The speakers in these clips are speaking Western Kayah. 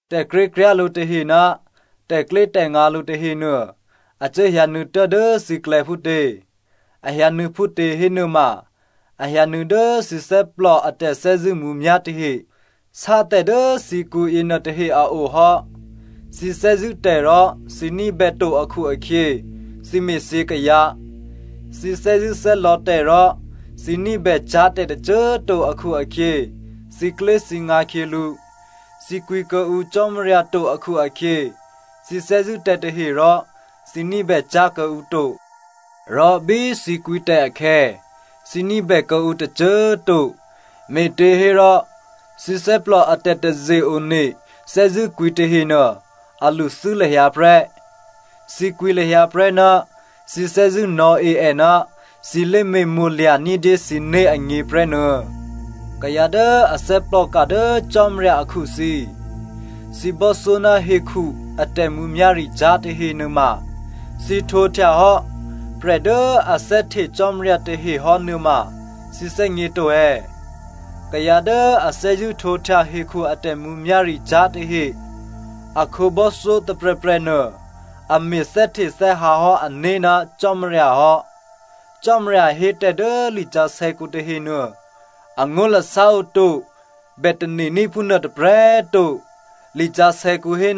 Tè̤krékryá̤ lǔ tahe ná tè̤klyétè̤ngǎ lǔ tahenuô a cuố hyǎnuô̌ tuố̤dố thǐklè̌ phútě? A hyǎnuô̌ phútě hénuôma, a hyǎnuô̌ dố thǐ thè́plò a tè̤thè́zṳ̂́ mǔmyá̤ tahe sátè̤ dố thǐkǔ yěnuô tahe a o hò́. Thǐ thè́zṳ̂́ tè̤ rò thǐ ní̤bèto akhu-akhyě thǐ me̤thyě kayǎ. Thǐ thè́zṳ̂́thè́lò̌ tè̤ rò thǐ ní̤bècyá̤ tè̤tôcô꤮ to akhu-akhyě, thǐklyéthǐngǎ khyělǔ. Thǐ kwǐ kuô̌ǔ Cò́marya to akhu-akhyě, thǐ thè́zṳ̂́ tè̤ tahe rò thǐ ní̤bè cyá̤ kuô̌ǔ to. Rò bí thǐ kwǐ tè̤ akhè̌, thǐ ní̤bè kuô̌ǔ tôcô꤮ to, me̤těhérò thǐ thè́plò a tè̤taze-one thè́zṳ̂́kwǐ tahenuô, a lṳthû́ lahyǎ prè́. Thǐ kwǐ lahyǎ prè́ ná thǐ thè́zṳ̂́ nò̌e è ná thǐ lé̤me̤mo̤lya̤ ní̤dyé thǐné̤ agně prè́ nuô̌. Kayǎ dố a thè́plòka dố Cò́marya akhu thǐ꤮, thǐ bò́thyó ná hekhu a tè̤mǔmyá̤ricyá̤ tahe nuôma thǐ htwǒhtyahò́ prè̤ dố a thè́hte Cò́marya tahehò́ nuôma thǐ thè́gně to è̌? Kayǎ dố a thè́zṳ̂́ htwǒhtya hekhu a tè̤mǔmyá̤ricyá̤ yětahe a khǒbò́thyó tôprè̤prè̤nuô a me̤ thè́htethè́hǎ hò́ ané̤ ná Cò́marya hò́. Cò́marya hé tè̤ dố lisǎsè̌kǔ tahenuô, angó̤lasá oto bè tane̤ní̤ phúnuô tôprè̤꤮ to. Lisǎsè̌kǔ hé,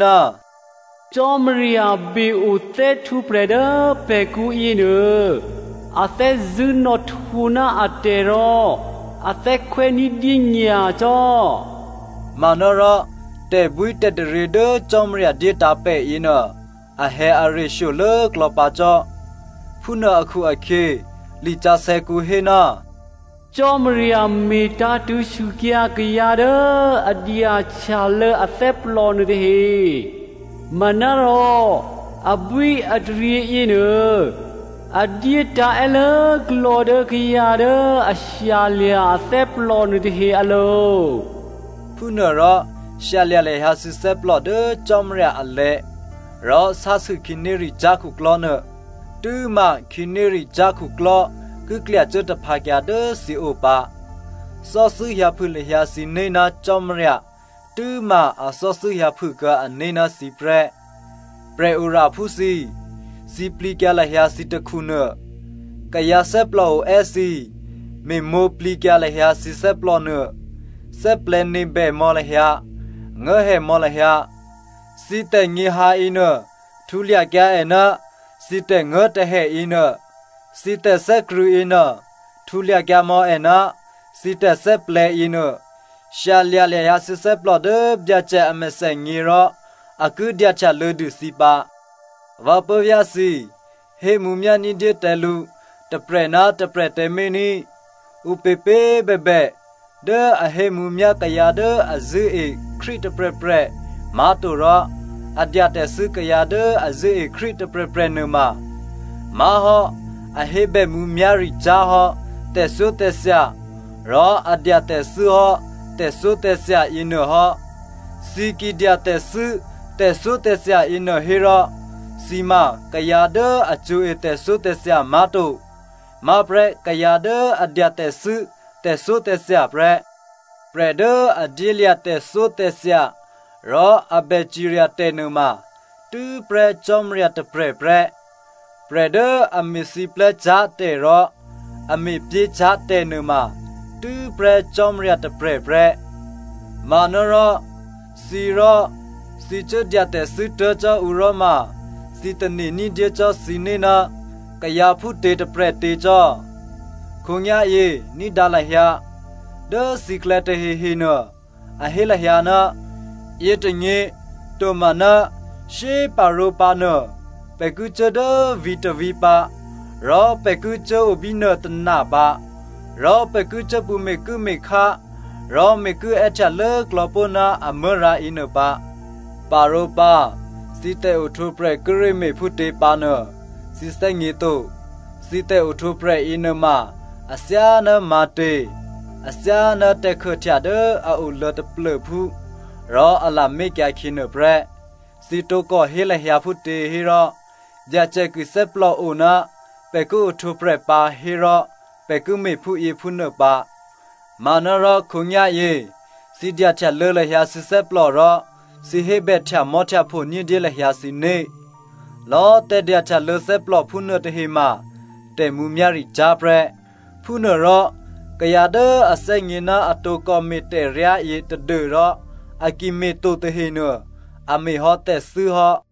“Cò́marya be-o thè́htwǒprè̤ dố pè̤kǔ yěnuô, a thè́zṳ̂́ nò̌htwǒ ná atè̤ rò a thè́khwè́ ní̤dyé nyacò́.” Manárò tè̤bwítè̤taryě dố Cò́marya dyétǎ̤ pè̤ yěnuô, ahè̌are shyolố klò̌pǎ cò́. Phúnuô akhu-akhyě lisǎsè̌kǔ hé, “Cò́marya me̤tǎ̤tṳ̂̌ sûkyǎ kayǎ dố a dyahtyalô̌ athè́plò nuôtahe, manárò abwíataryě yěnuô a dyétǎ̤ è́lốklò̌ dố kayǎ dố a shyalya̤ athè́plò nuôtahe alo̤.” Phúnuôrò shyalya̤ lahyǎ thǐ thè́plò dố Cò́marya alè̤̌, rò sásû khǐnéricyá̤ khuklò́ nuô tû́ma khǐnéricyá̤ khuklò́ ki klya cuố taphǎkyǎ dố thǐo pǎ. Thò́thû́ hyǎphû lahyǎ thǐné̤ ná Cò́marya tû́ma a thò́thû́ hyǎphûkuô̌ ané̤ ná thǐ prè́. Prè̤oraphú thǐ꤮, sǐplǐkyǎ lahyǎ thǐ takhunuô. Kayǎ thè́plò oè́ thǐ꤮, me̤mwǒ̤plǐkyǎ lahyǎ thǐ thè́plònuô. Thè́plè̤̌nebè mò̌ lahyǎ, nguố̤hè mò̌ lahyǎ. Thǐ tè̤nyě̤hǎ yěnuô htulyakyǎ è ná thǐ tè̤nguố̤tè̤hè yěnuô, thǐ tè̤thè́krṳ̂̌ yěnuô htulya kyǎmò̌ è ná thǐ tè̤thè́plè̤̌ yěnuô. Shyalya̤ lahyǎ thǐ thè́plò dố Byacè a mèthènyě rò a ki dyahtyalô̌dû thǐ pǎ. Vǎ puố̤vyá̤ thǐ꤮, hémǔmyá̤ ní̤dyé tǎ lǔ tôprè̤ ná tôprè̤ tǎmé̤ ní꤮. Ǔpěpě꤮ bèbè dố a hémǔmyá̤ kayǎ dố a zṳ̂́e Krístu tôprè̤prè̤ má̤torò a dya tè̤thû́ kayǎ dố a zṳ̂́e Krístu tôprè̤prè̤ nuôma má̤hò́ a hébè mǔmyá̤ricyá̤ hò́ tè̤thyótè̤thya rò a dya tè̤thû́ hò́ tè̤thyótè̤thya yěnuô hò́. Thǐ ki dya tè̤thû́ tè̤thyótè̤thya yěnuô hérò, thǐ ma kayǎ dố a cṳ̌e tè̤thyótè̤thya má̤to. Má̤prè́ kayǎ dố a dya tè̤thû́ tè̤thyótè̤thya prè́. Prè̤ dố a dyélya̤ tè̤thyótè̤thya rò a bè cirya tè̤ nuôma tû́prè́ Cò́marya tôprè̤ prè́. Prè̤ dố a me̤siplè́cyá̤ tè̤ rò a me̤pyécyá̤ tè̤ nuôma tû́prè́ Cò́marya tôprè̤ prè́. Manárò thǐ rò, thǐ cuố dya tè̤thû́ tuố̤ cò́ ǔ rò ma thǐ tane̤ ní̤dyé cò́ thǐné̤ ná kayǎ phútě tôprè̤tě cò́? Khǒnyá̤yě ní̤dǎ lahyǎ, dố thǐklè̌ tahehenuô a hé lahyǎ, “Yětônyě tomaná shyéparǒ pǎ nuô, pè̤ ki cuố dố vǐ̤tôvǐ̤ pǎ rò pè̤ ki cuố o bínuô tôna pǎ. Rò pè̤ ki cuố pṳ̌ me̤kuố̤me̤khá rò me̤kuố̤ è́htyalốklò̌ pó̤ ná amuố̤rǎ yěnuôpǎ.” Parǒpǎ thǐ tè̤ohtwǒprè̤ kíré̤ me̤phútě pǎ nuô, thǐ thè́gně to. Thǐ tè̤ohtwǒprè̤ yěnuôma athyáná ǐtě? Athyáná tè̤khuôhtya dố a oluô̌ taplô̤phú rò a lamé̤kyǎ khyě nuôprè́. Thǐ tǒkò hé lahyǎ phútě hérò, “Byacè ki thè́plòo ná pè̤ ki ohtwǒprè̤ pǎ hérò pè̤ ki me̤ phúyěphúnuô pǎ,” manárò khǒnyá̤yě thǐ dyahtyalô̌ lahyǎ thǐ thè́plò rò thǐ hébè htyamò́htyapho ní̤dyé lahyǎ thǐné̤. Lò̌꤮ tè̤dyahtyalô̌ thè́plò phúnuô tahema tè̤mǔmyá̤ricyá̤ prè́. Phúnuôrò kayǎ dố a thè́gně ná a tǒkò me̤ tè̤ryá yě tadû́rò a ki me̤to tahenuô, a me̤hò́ tè̤thû́hò́.